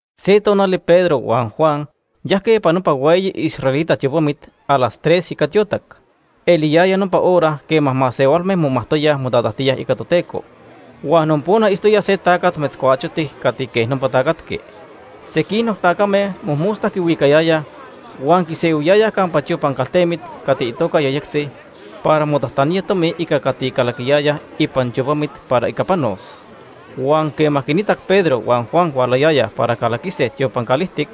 Se tonali Pedro huan Juan yajque ipan nopa hueyi israelita tiopamit a las tres ica tiotac. Eliyaya nopa hora quema masehualme momajtoyaj motatajtíaj ica Toteco. Huan nopona itztoya se tacat metzcuachotic cati quej nopa tacatqui. Sequinoc tacame mojmosta quihuicayayaj huan quisehuiyayaj campa tiopan caltemit cati itoca Yejyectzi para motajtanía tomi ica cati calaquiyayaj ipan tiopamit para ica panos. Huan quema quinitac Pedro huan Juan hualayayaj para calaquise tiopan calijtic,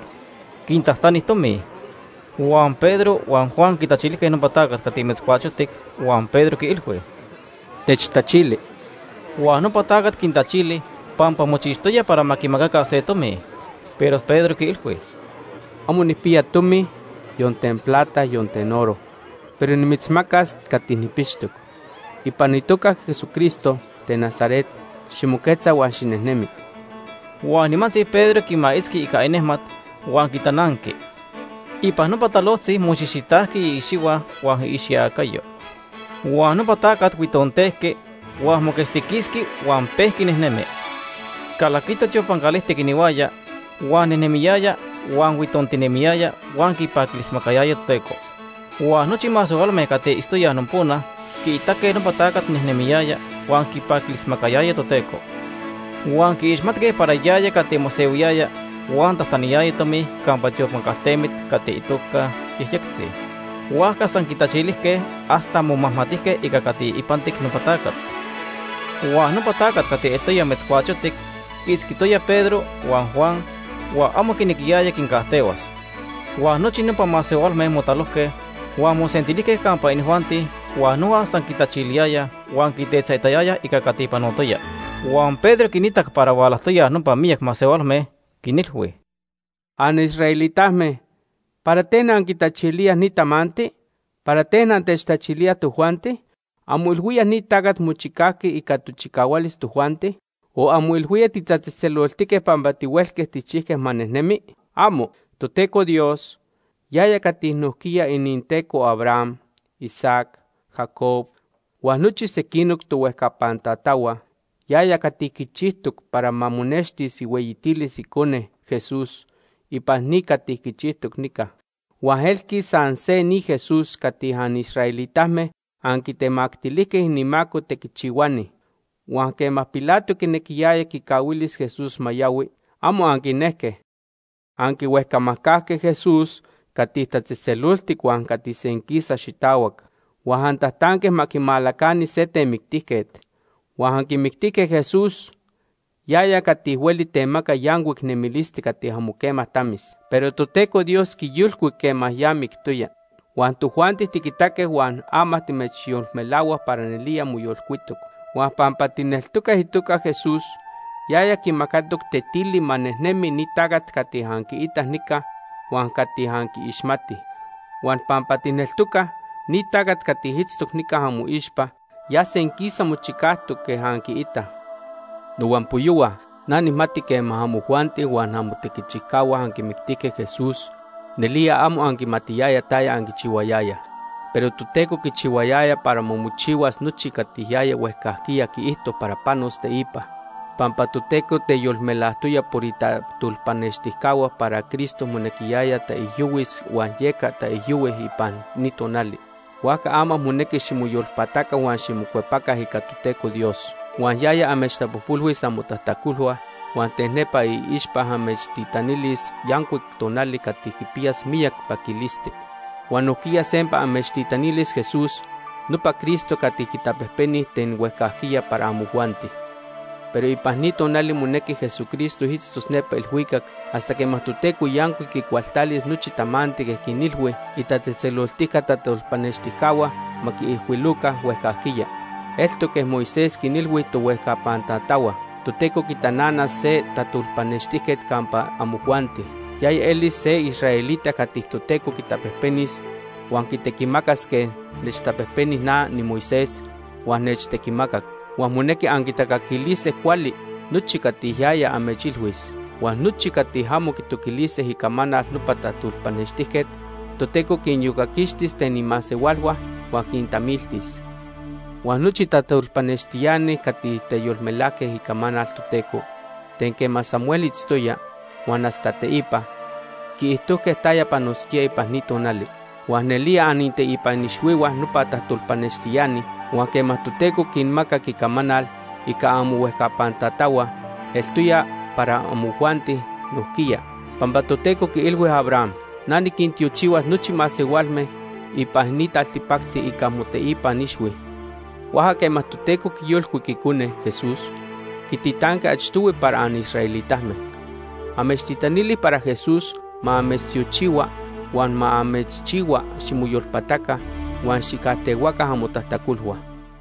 quintajtani tomi. Huan Pedro huan Juan quitachilijque nopa tacat cati metzcuachotic huan Pedro quiilhui: ―Techtachili. Huan nopa tacat quintachili pampa mochixtoya para ma quimacaca se tomi. Pero Pedro quiilhui: ―Amo nijpiya tomi, yon ten plata, yon ten oro, pero nimitzmacas cati nijpixtoc. Ipan itoca Ica itequiticayo. Jesucristo ten Nazaret, ximoquetza huan xinejnemi. Huan nimantzi Pedro quimaitzqui ica inejmat huan quitananqui. Ipan nopa talojtzi moxijxitajqui iicxihua huan iicxiacayo. Huan nopa tacat huitontejqui, huan moquetztiquisqui huan pejqui nejnemi. Calaquito tiopan calijtic inihuaya, huan nejnentinemiyaya, huan huitontinemiyaya huan quipaquilismacayaya Toteco. Huan nochi masehualme cati itztoyaj nopona quiitaque nopa tacat nejnemiyaya huan quipaquilismacayaya Toteco. Huan quiixmatque para yaya cati mosehuiyaya huan tajtaniyaya tomi campa tiopan caltemit cati itoca Yejyectzi. Huajca san quitachilijque hasta momajmatijque ica cati ipantic nopa tacat. Huan nopa tacat cati eltoya metzcuachotic quiitzquitoya Pedro huan Juan huan amo quinequiyaya quincajtehuas. Huan nochi nopa masehualme motalojque, huan mosentilijque campa inijuanti huan noja san quitachiliyayaj huan quitetzaitayayaj ica cati panotoya. Huan Pedro quinitac para hualajtoyaj nopa miyac masehualme, quinilhui: “Anisraelitame, ¿para ten anquitachilíaj ni tamanti? ¿Para ten antechtachilíaj tojuanti? ¿Anmoilhuíaj ni tacat mochicajqui ica tochicahualis tojuanti o anmoilhuíaj titatzejtzeloltique pampa tihuelque tijchijque ma nejnemi? ¡Amo! Toteco Dios, yaya cati nojquiya ininTeco Abraham, Isaac, Jacob, huan nochi sequinoc tohuejcapan tatahua, yaya cati quichijtoc para ma monextis ihueyitilis Icone, Jesús ipan ni cati quichijtoc nica. Huan elqui san se ni Jesús cati anisraelitame anquitemactilijque inimaco tequichihuani. Huan quema Pilato quinequiyaya quicahuilis Jesús ma yohui, amo anquinejque. Anquihuejcamajcajque Jesús cati tatzejtzeloltic huan cati senquisa xitahuac. Huan antajtanque ma amechmajcahuili se temictijquet. Huan anquimictijque Jesús, yaya cati hueli temaca yancuic nemilisti cati amo quema tamis. Pero Toteco Dios quiyolcuic quema ya mictoya. Huan tojuanti tiquitaque huan ama timechyolmelahuaj para nelía moyolcuitoc. Huan pampa tijneltocaj itoca Itequiticayo. Jesús, yaya quimacatoc tetili ma nejnemi ni tacat cati anquiitaj nica huan cati anquiixmatij. Huan pampa tijneltocaj, ni tacat cati itztoc nica amoixpa ya senquisa mochicajtoc quej anquiitaj. “Nohuampoyohua, na nijmati quema amojuanti huan amotequichijcahua anquimictijque Jesús, nelía amo anquimatiyayaj taya anquichihuayayaj. Pero Toteco quichihuayaya para ma mochihuas nochi cati yaya huejcajquiya quiijto para panos teipa. Pampa Toteco teyolmelajtoya por itajtolpanextijcahua para Cristo monequiyaya taijyohuis huan yeca taijyohui ipan ni tonali. Huajca ama monequi ximoyolpataca huan ximocuepaca ica Toteco Dios. Huan yaya amechtapojpolhuis amotajtacolhua huan ten nepa iixpa amechtitanilis yancuic tonali cati quipiyas miyac paquilisti. Huan nojquiya sempa amechtitanilis Jesús, nopa Cristo cati quitapejpeni ten huejcajquiya para amojuanti. Pero ipan ni tonali monequi Jesucristo itztos nepa ilhuicac hasta quema Toteco yancuic quicualtalis nochi tamanti quej quinilhui itatzejtzeloltica tajtolpanextijcahua ma quiijcuiloca huejcajquiya. Eltoc quej Moisés quinilhui tohuejcapan tatahua: ‘Toteco quitananas se tajtolpanextijquet campa amojuanti. Yaya elis se israelita cati Toteco quitapejpenis huan quitequimacas quej nechtapejpeni na niMoisés huan nechtequimacac. Huan monequi anquitacaquilise cuali nochi cati yaya amechilhuis. Huan nochi cati amo quitoquilise icamanal nopa tajtolpanextijquet, Toteco quiniyocaquixtis ten imasehualhua huan quintamiltis.’ “Huan nochi tajtolpanextiani cati teyolmelajque icamanal Toteco ten quema Samuel itztoya huan hasta teipa, quiijtojque taya panosquía ipan ni tonali. Huan nelía anininteipan ixhuihua nopa tajtolpanextiani. Huan quema Toteco quinmacac icamanal ica amohuejcapan tatahua eltoya para amojuanti nojquiya. Pampa Toteco quiilhui Abraham: ‘Na niquintiochihuas nochi masehualme ipan ni taltipacti ica moteipan ixhui.’ Huajca quema Toteco quiyolcuic Icone, Jesús, quititanqui achtohui para anisraelitame. Amechtitanili para Jesús ma amechtiochihua huan ma amechchihua ximoyolpataca huan xijcajtehuaca amotajtacolhua.”